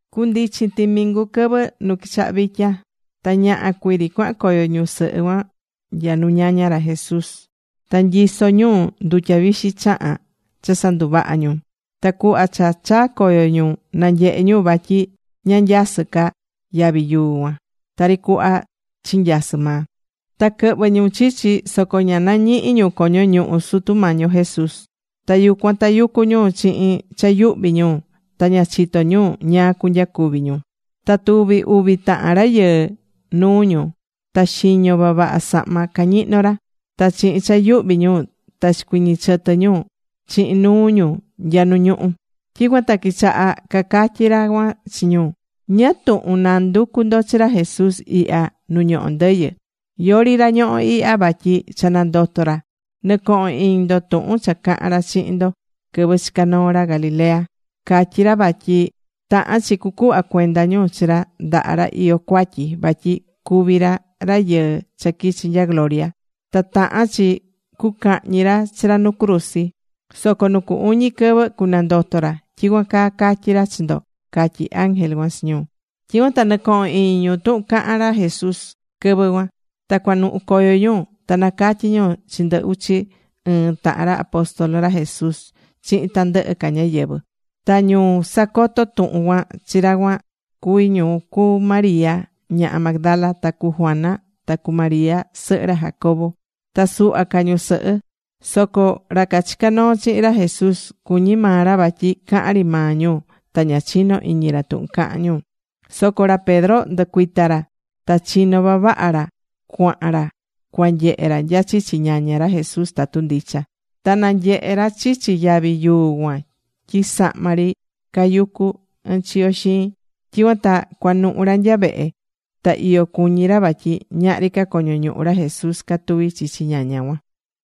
Cundichin timingu quɨvɨ nu quichaha vitya. Ta ñaha cuiri cuahan coyo ñusɨhɨ cuan nya nu ñaña ra Jesús. Ta nyisó ñu ndutya vixi chahán cha sanduvaha̱ ñu. Ta cuhva cha chaa̱ coyo ñu, nanyehe̱ ñu vatyi ña nyasɨ́ ca yavi yuu cuan tari cuhva chinyasɨ̱ maa. Ta quɨhvɨ̱ ñu chichi, soco ña nañihi̱ ñu coño ñuhu Sutu Mañi yo Jesús. Ta yucuan tayucú ñu chihin cha yuhví ñu. Ta ña chitó ñu ñáá cunyacuvi ñu. Ta tuvi̱ uvi tahan rayɨɨ nuu ñu. Ta xiño vavaha sahma cañihnó ra. Ta chihin cha yuhví ñu, ta chicuiñi̱ chɨtɨ ñu chihin nuu ñu nya nu ñuhú. Tyicuan ta quichaha cacatyi ra cuan chi ñu: ―¿Ñáá tuhun nanducú ndo chi ra Jesús ihya nu ñohó ndɨyɨ? Yori ra ñohó ihya, vatyi cha nandoto̱ ra. Nɨ̱cohon iñi ndo tuhun cha caha̱n ra chihin ndo quɨvɨ chicá noo ra Galilea. Catyi̱ ra vatyi tahán chi cucuhva cuenda ñu chi ra ndaha ra iyó cuatyi. Vatyi cuví ra Rayɨɨ cha quichi̱ nya gloria. Ta tahán chi cucahñi ra chi ra nu cruzi. Soco nu cu uñi quɨvɨ cunandoto ra. Tyicuan caa catyi̱ ra chi ndo ―catyí ángel cuan chi ñu. Tyicuan ta nɨcoho̱n iñi ñu tuhun caha̱n ra Jesús quɨvɨ cuan. Ta cuanuhu coyo ñu. Ta nacatyi̱ ñu chi ndɨ uchi ɨɨn tahan ra apóstol ra Jesús chihin tandɨhɨ ca ñáyɨvɨ. Ta ñu sacoto̱ tuhun cuan chi ra cuan cuví ñu cu María, ñaha Magdala, ta cu Juana, ta cu María sɨhɨ ra Jacobo, ta suhva ca ñusɨhɨ. Soco ra cachica̱ noo chihin ra Jesús cuñí maa ra vatyi cahán ri maa ñu. Ta ña chinó iñi ra tuhun cahán ñu. Soco ra Pedro nducuita̱ ra ta chino̱ vavaha ra cuahan ra cuanyehe ra nya chichi ñaña ra Jesús tatu ndicha. Ta nanyehe̱ ra chichi yavi yuu cuan tyi sahma ri cayucú ɨnchiyo xiin. Tyicuan ta cuanuhu ra nya vehe. Ta iyo cuñí ra vatyi ñahri ca coño ñuhu ra Jesús catuví chichi ñaña cuan.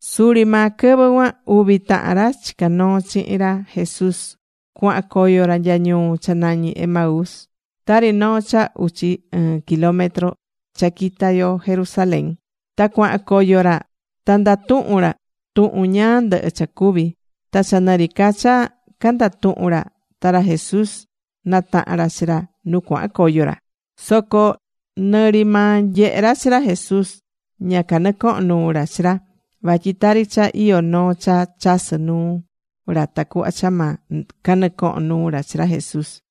Suri maa quɨvɨ cuan, uvi tahan ra chicá noo chihin ra Jesús cuahan coyo ra nya ñuu cha nañí Emaús, tari noo cha uchi ɨɨn kilómetro cha quita yo Jerusalén. Ta cuahan coyo ra ta ndatuhún ra tuhun ñáá ndɨhɨ cha cuvi̱. Ta cha nɨ ri ca cha candatuhún ra, ta ra Jesús nataha̱n ra chi ra nu cuahan coyo ra. Soco nɨ ri maa nyehé ra chi ra Jesús, ña canɨcohon nuu ra chi ra. Vatyi tari cha iyó noo cha chasɨ nuu ra tacuhva cha ma canɨcohon nuu ra chi ra Jesús.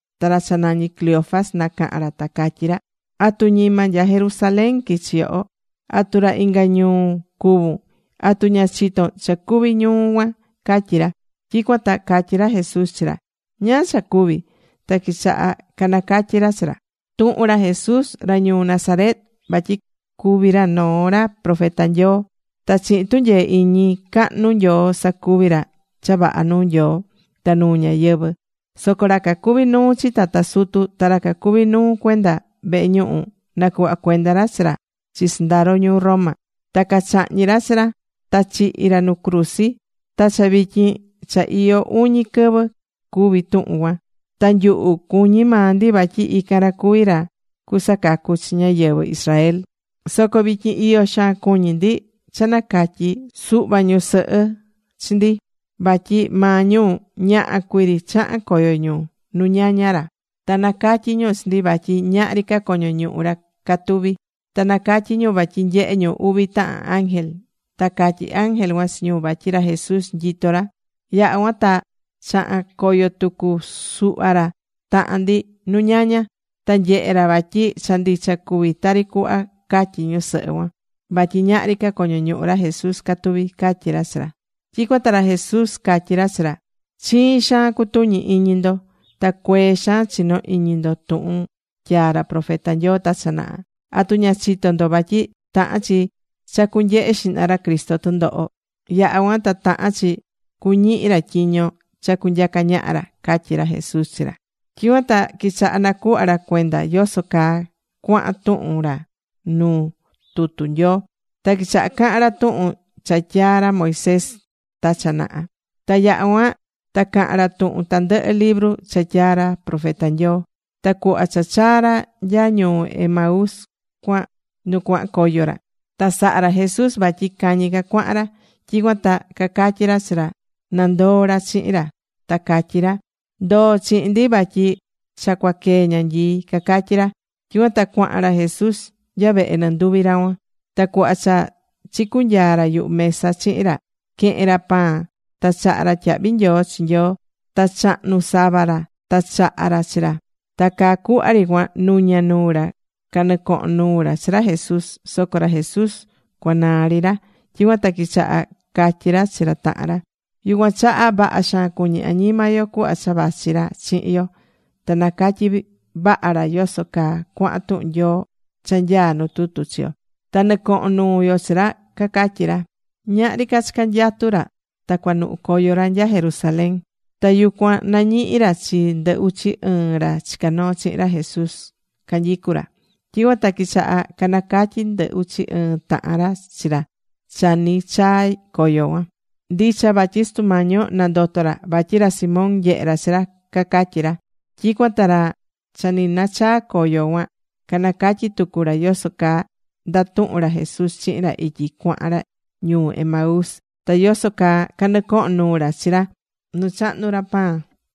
Ta ra cha nañí Cleofas, nacaha̱n ra. Ta catyí ra: ―¿Atu ñima nya Jerusalén quichi yoho? ¿Atu ra inga ñuu cuvún? ¿Atu ña chitón cha cuvi̱ ñuu cuan? ―catyí ra. Tyicuan ta catyí ra Jesús chi ra: ―¿Ñáá cha cuvi̱? Ta quichaha canacatyi̱ ra chi ra: ―Tuhun ra Jesús ra ñuu Nazaret. Vatyi cuvi̱ ra noo ra profeta Nyoo. Ta chihin tunyee iñi cahnu Nyoo sacuvi̱ ra cha vaha nuu Nyoo ta nuu ñáyɨvɨ. Soco ra cacuví nuu chi tata sutu ta ra cacuví nuu cuenda vehe ñuhu, nacuhva̱ cuenda ra chi ra chi sɨndaro ñuu Roma. Ta cachahñi̱ ra chi ra. Ta chihi̱ ra nu cruzi. Ta cha vityin cha iyó uñi quɨvɨ cuvi̱ tuhun cuan. Ta nyuhu cuñí maa ndi vatyi ican ra cuví ra cusacacu chi ñáyɨvɨ Israel. Soco vityin iyo xaan cuñí ndi cha nacatyi̱ suhva ñusɨhɨ chi ndi. Vatyi maa ñu, ñaha cuii ri chaha̱n coyo ñu nu ñaña ra. Ta nacatyi̱ ñu chi ndi vatyi ñahri ca coño ñuhu ra catuví. Ta nacatyi̱ ñu vatyi nyehe̱ ñu uvi tahan ángel. Ta catyí ángel cuan chi ñu vatyi ra Jesús nyitó ra. Yaha̱ cuan ta chaha̱n coyo tucu suhva ra tahan ndi nu ñaña. Ta nyehe̱ ra vatyi cha ndicha cuví tari cuhva catyí ñusɨhɨ cuan. Vatyi ñahri ca coño ñuhu ra Jesús catuví ―catyí ra chi ra. Tyicuan ta ra Jesús catyí ra chi ra: ―Chiin xaan cutuñí iñi ndo. Ta cuee xaan chinó iñi ndo tuhun tyaa̱ ra profeta Nyoo ta cha naha. ¿Atu ña chitó ndo vatyi tahán chi cha cunyehe xihna ra Cristo tundoho? Yaha cuan ta tahán chi cuñihi ra tyiño cha cunyaca ñaha ra ―catyí ra Jesús chi ra. Tyicuan ta quichaha nacuhva ra cuenda yoso caa cuahan tuhun ra nu tutu Nyoo. Ta quichaha cahan ra tuhun cha tyaa̱ ra Moisés ta cha naha. Ta yaha̱ cuan ta caha̱n ra tuhun tandɨhɨ libru cha tyaa̱ ra profeta Nyoo. Ta cuhva cha chaa̱ ra nya ñuu Emaús cuan nu cuahan coyo ra, ta saha̱ ra Jesús vatyi cañi ca cuahan ra. Tyicuan ta cacatyi ra chi ra na ndoo ra chihin ra. Ta catyi ra: ―Ndo̱o chihin ndi vatyi cha cua quee ñanyii ―cacatyí ra. Tyicuan ta cuahan ra Jesús nya vehe nɨnduvi ra cuan. Ta cuhva cha chicunyaa̱ ra yuhu mesa chihin ra, quehe̱n ra pan. Ta chaha̱ ra tyahvi nyoo chi Nyoo. Ta chahnu̱ sava ra, ta chaha̱ ra chi ra. Ta caa cuhva ri cuan nuña nuu ra canɨcohon nuu ra chi ra Jesús. Soco ra Jesús cuanaa ri ra. Tyicuan ta quichaha catyí ra chi ra tahan ra: ―Yucuan chaha vaha xaan cuñí añima yo cuhva cha vachi ra chihin yo, ta nacatyi̱ vaha ra yoso caa cuahan tuhun Nyoo cha nyaa nu tutu chi yo, ta nɨcohon nuu yo chi ra ―cacatyí ra. Ñahri ca cha canyatu̱ ra, ta cuanuhu coyo ra nya Jerusalén. Ta yucuan nañihi̱ ra chi ndɨ uchi ɨɨn ra chicá noo chihin ra Jesús, canyicú ra. Tyicuan ta quichaha canacatyi ndɨ uchi ɨɨn tahan ra chi ra cha nɨchaa coyo cuan: ―Ndicha vatyi Sutu Mañi yo, nandoto̱ ra. Vatyi ra Simón nyehe̱ ra chi ra ―cacatyí ra. Tyicuan ta ra cha ni nachaa coyo cuan canacatyi̱ tucu ra yoso caa ndatuhu̱n ra Jesús chihin ra ityi cuahan ra ñuu Emaús, ta yoso caa canɨcoho̱n nuu ra chi ra nu chahnu̱ ra pan.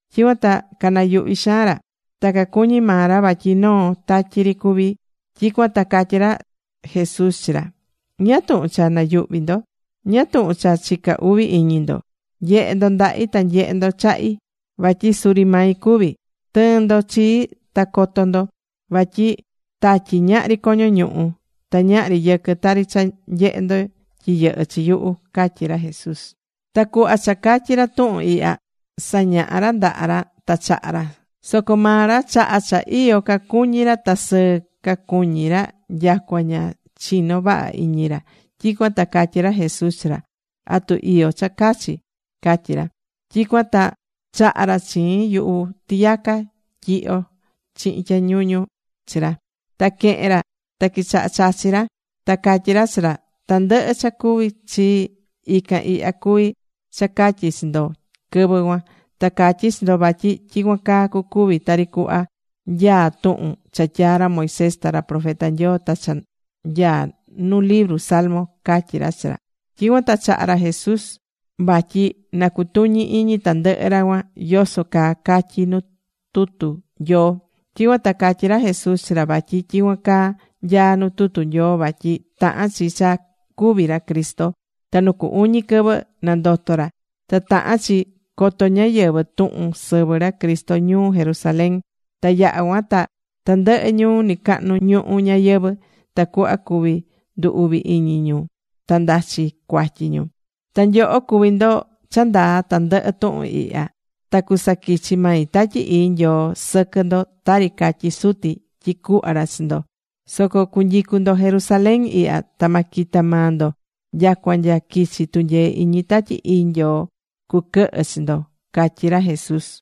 Tyicuan ta canayuhví xaan ra. Ta cacuñí maa ra vatyi noo tatyi ri cuví. Tyicuan ta catyí ra Jesús chi ra: ―¿Ñáá tuhun cha nayuhvi ndo? ¿Ñáá tuhun cha chicá uvi iñi ndo? Nye̱he ndo ndahi. Ta nye̱he ndo chahi. Vatyi suri mai cuví. Tɨ̱ɨn ndo chii ta co̱to ndo. Vatyi tatyi, ñahri coño ñuhu. Ta ñahri yɨquɨ tari cha nyehé ndo tyi yɨhɨ́ chi yuhu ―catyí ra Jesús. Ta cuhva cha catyi̱ ra tuhun ihya, sañahá ra ndaha ra ta chaha ra. Soco maa ra chaha cha iyo cacuñí ra ta sɨɨ cacuñí ra nyacua ña chinó vaha iñi ra. Tyicuan ta catyí ra Jesús chi ra: ―¿Atu iyo cha cachi? ―catyí ra. Tyicuan ta chaha̱ ra chiin yuhu tiyaca tyihyo chihin tyañuñu chi ra. Ta quehe̱n ra. Ta quichaha chachi ra. Ta catyí ra chi ra: ―Tandɨhɨ cha cuvi̱ chii, ican ihya cuví cha catyi̱ chi ndo quɨvɨ cuan. Ta catyi̱ chi ndo vatyi tyicuan caa cucuvi, tari cuhva nyaá tuhun cha tyaa̱ ra Moisés ta ra profeta Nyoo ta cha nyaá nu libru salmo ―catyí ra chi ra. Tyicuan ta chaha̱ ra Jesús vatyi na cutuñi iñi tandɨhɨ ra cuan yoso caa catyí nu tutu Nyoo. Tyicuan ta catyí ra Jesús chi ra vatyi tyicuan caa nyaá nu tutu Nyoo vatyi tahán chi cha cúvi ra Cristo. Ta nu cu uñi quɨvɨ nandoto ra. Ta tahán chi coto ñáyɨvɨ tuhun sɨvɨ ra Cristo ñuu Jerusalén, ta yaha cuan ta tandɨhɨ ñuu nɨcahnu ñuhu ñayɨvɨ̱. Tacuhva cuvi ndu uvi iñi ñu ta ndachi cuatyi ñu. ―Ta nyoho cuví ndo cha ndaa tandɨhɨ tuhun ihya. Ta cusaquichi mai Tatyi Ii Nyoo sɨquɨ ndo tari catyi̱ Suti tyi cuhva ra chi ndo. Soco cu̱nyicu ndo Jerusalén ihya. Ta ma quita maa ndo nyacua nya quichi tunyee iñi Tatyi Ii Nyoo cuquɨhɨ chi ndo ―catyí ra Jesús.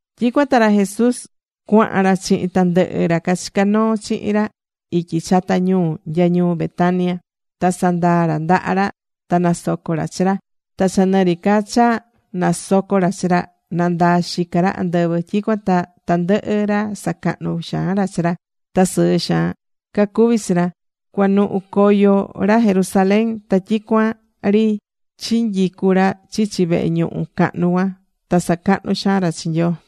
Tyicuan ta ra Jesús cuahan ra chihin tandɨhɨ ra cachicá noo chihin ra ityi chata ñuu, nya ñuu Betania. Ta sandaa̱ ra ndaha ra. Ta nasoco̱ ra chi ra. Ta cha nɨ ri ca cha nasocó ra chi ra, nandaa̱ xica ra andɨvɨ. Tyicuan ta tandɨhɨ ra sacahnú xaan ra chi ra. Ta sɨɨ xaan cacuví chi ra, cuanuhu coyo ra Jerusalén. Ta tyicuan ri chinyicú ra chichi vehe ñuhu cahnu cuan, ta sacahnú xaan ra chi Nyoo.